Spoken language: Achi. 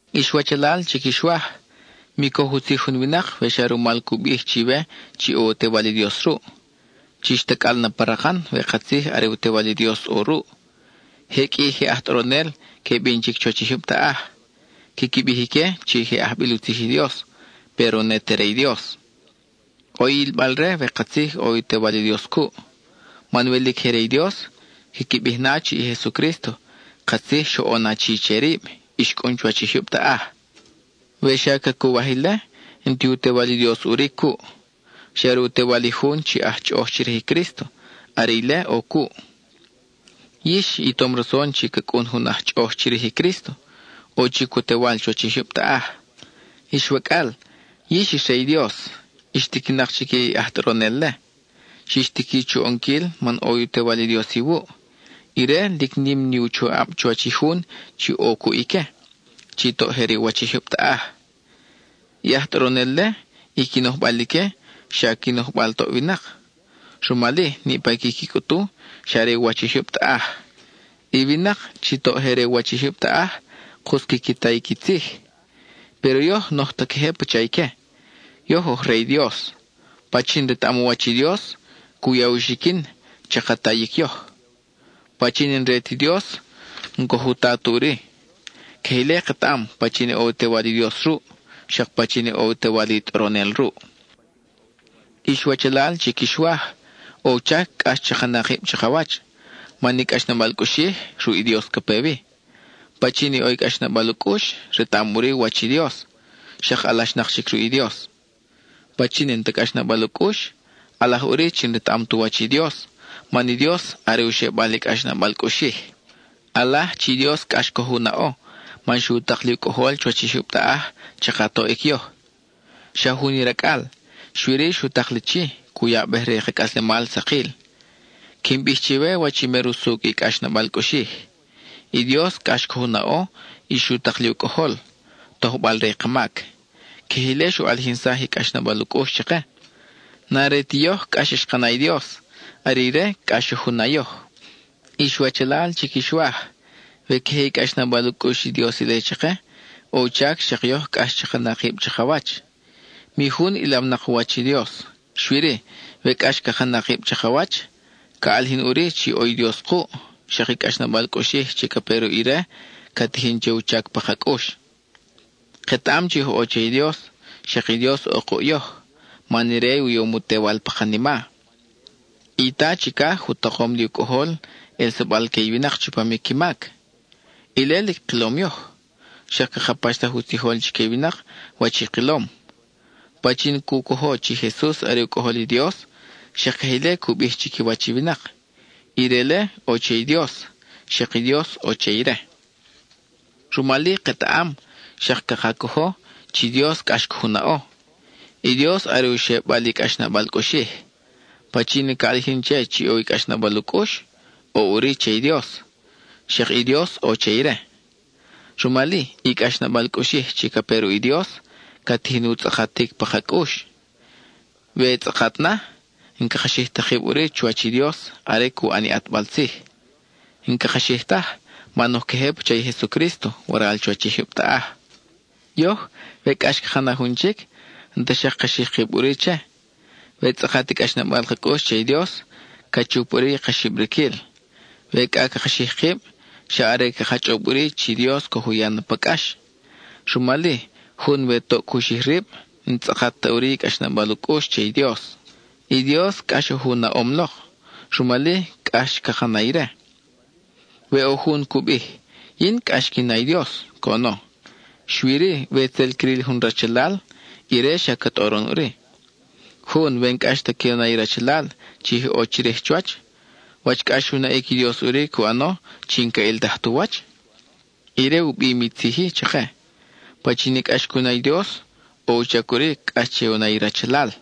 Ix wachalal chi quix waj, mi coj u tzij jun winak we xa rumal cu bij chiwe chi ʼo u Tewal i Dios ruʼ. Chix tacʼal na pa rakan we katzij are u Tewal i Dios ʼo ruʼ. Je qʼui i je aj tʼoronel que bin chic chuwach i jyub taʼaj; quiqui bij ique chi je ajbil u tzij i Dios, péro ne te re i Dios. ʼO i ʼilbal-re we katzij ʼo u Tewal i Dios cuʼ, man we lic je re i Dios, quiqui bij na chi i Jesucrísto katzij xoʼon achi che rib y xcʼun chuwach i jyub taʼaj. We xa cacuwaj ile, n-ti u Tewal i Dios ʼuri cuʼ; xa are u tewal i jun chi aj chʼoʼoj chirij i Crísto, are ile ʼo cuʼ. Yix i tom rason chi ca cʼun jun aj chʼoʼoj chirij i Crísto; ʼo chic u tewal chuwach i jyub taʼaj. Ix wacʼal, yix ix re i Dios; ix tiquinak chique i aj tʼoronel-le. Xix tiqui chu ʼonquil man ʼo u Tewal i Dios iwuʼ; ire, lic nim ni u choʼab chuwach i jun chi ʼo cuʼ ique, chi toʼ je re u wach i jyub taʼaj. I aj tʼoronel-le, i qui nojbal ique xa qui nojbal toʼ winak; rumal-i, niʼpa i quiqui cʼutu xa re u wach i jyub taʼaj. I winak chi toʼ je re u wach i jyub taʼaj, kus quiqui ta i qui tzij. Péro yoj n-oj ta queje pacha ique; yoj oj re i Dios. Pachin retaʼam u wach i Dios, cu ya u xiquin chaka tayic yoj. Pachin i n-re ti Dios n-coj u ta ta ʼuri. Queje ile ketaʼam pachin ʼo i u Tewal i Dios ruʼ, xak pachin ʼo i u tewal i tʼoronel ruʼ. Ix wachalal chi quix waj, ʼo u chac cʼax chaka na kib chakawach, man i cʼaxnabal cʼuxij, ruʼ i Dios ca pe wi. Pachin ʼo i cʼaxnabal u cʼux, retaʼam ʼuri u wach i Dios, xak alaxnak chic ruʼ i Dios. Pachin n-ta cʼaxnabal u cʼux, ʼalaj ʼuri chi n-retaʼam tu wach i Dios, man i Dios are u xebal i cʼaxnabal cʼuxij. ʼAlaj chi Dios cʼax coj u naʼo, man xu tak li u Cʼojol chuwach i jyub taʼaj chaka toʼic yoj. Xa jun i Racʼal; xui-ri, xu tak li chi, cu yabej re i ka cʼaslemal sakil. Quin bij chiwe wach i mer usucʼ i cʼaxnabal cʼuxij: i Dios cʼax coj u naʼo y xu tak li u Cʼojol, tojbal re i ka mac. Queje ile xu ʼalijinsaj i cʼaxnabal u cʼux chake. N-are ti yoj cʼax xka na i Dios; are ire cʼax xoj u na yoj. Ix wachalal chi quix waj, we queje i cʼaxnabal u cʼux i Dios ile chake, ʼo u chac xak yoj cʼax chaka na kib chakawach. Mi jun ʼilawnak u wach i Dios; xui-ri, we cʼax caka na kib chakawach, ca ʼalijin ʼuri chi ʼo i Dios kuʼ, xak i cʼaxnabal cʼuxij chi ca pe ruʼ ire ca tijin che u chac pa ka cʼux. Ketaʼam chi oj ʼo che i Dios, xak i Dios ʼo kuʼ yoj, man ire u yom u Tewal pa kanima. I Ta chicaj u takom li u Cʼojol ʼelsabal que i winak chupam i qui mac. Ile lic kilom yoj, xak caka paxsaj u tzijol chique i winak wach i kilom. Pachin cu cojo chi Jesus are u Cʼojol i Dios, xak queje ile cu bij chiquiwach i winak, ire-le ʼo che i Dios, xak i Dios ʼo che ire. Rumal-i ketaʼam, xak caka cojo, chi Dios cʼax coj u naʼo. I Dios are u xebal i cʼaxnabal cʼuxij. Pachin i ca ʼalijin che chi ʼo i cʼaxnabal u cʼux, ʼo ʼuri che i Dios, xak i Dios ʼo che ire. Rumal-i, i cʼaxnabal cʼuxij chi ca pe ruʼ i Dios ca tijin u tzʼakatic pa ka cʼux. We tzʼakat na, n-caka xij ta kib ʼuri chuwach i Dios are cu ʼan i ʼatbal tzij. N-caka xij taj, man oj queje pacha i Jesucrísto waral chuwach i jyub taʼaj. Yoj, we cʼax caka na jun chic, n-ta xak caka xij kib ʼuri che. We tzʼakat i cʼaxnabal ka cʼux che i Dios, ca chup ʼuri i ka xibriquil. We cʼa caka xij kib, xa are caka chʼob ʼuri chi Dios coj u ya na pa cʼax. Rumal-i, jun we toʼ cu xij rib, n-tzʼakat ta ʼuri i cʼaxnabal u cʼux che i Dios. I Dios cʼax oj u naʼom lok, rumal-i, cʼax caka na ire. We ʼo jun cu bij: “Yin cʼax quin na i Dios,” coʼono, xui-ri we tzel cril jun rachalal, ire xa ca tʼoron ʼuri. Jun, we n-cʼax ta que u na i rachalal chi je ʼo chirij chuwach, ¿wach cʼax u naʼic i Dios ʼuri cu ʼano, chi n-ca ʼiltaj tu wach? Ire u bim i tzij-i chake: pachin i cʼax cu na i Dios, ʼo u chac ʼuri cʼax che u na i rachalal.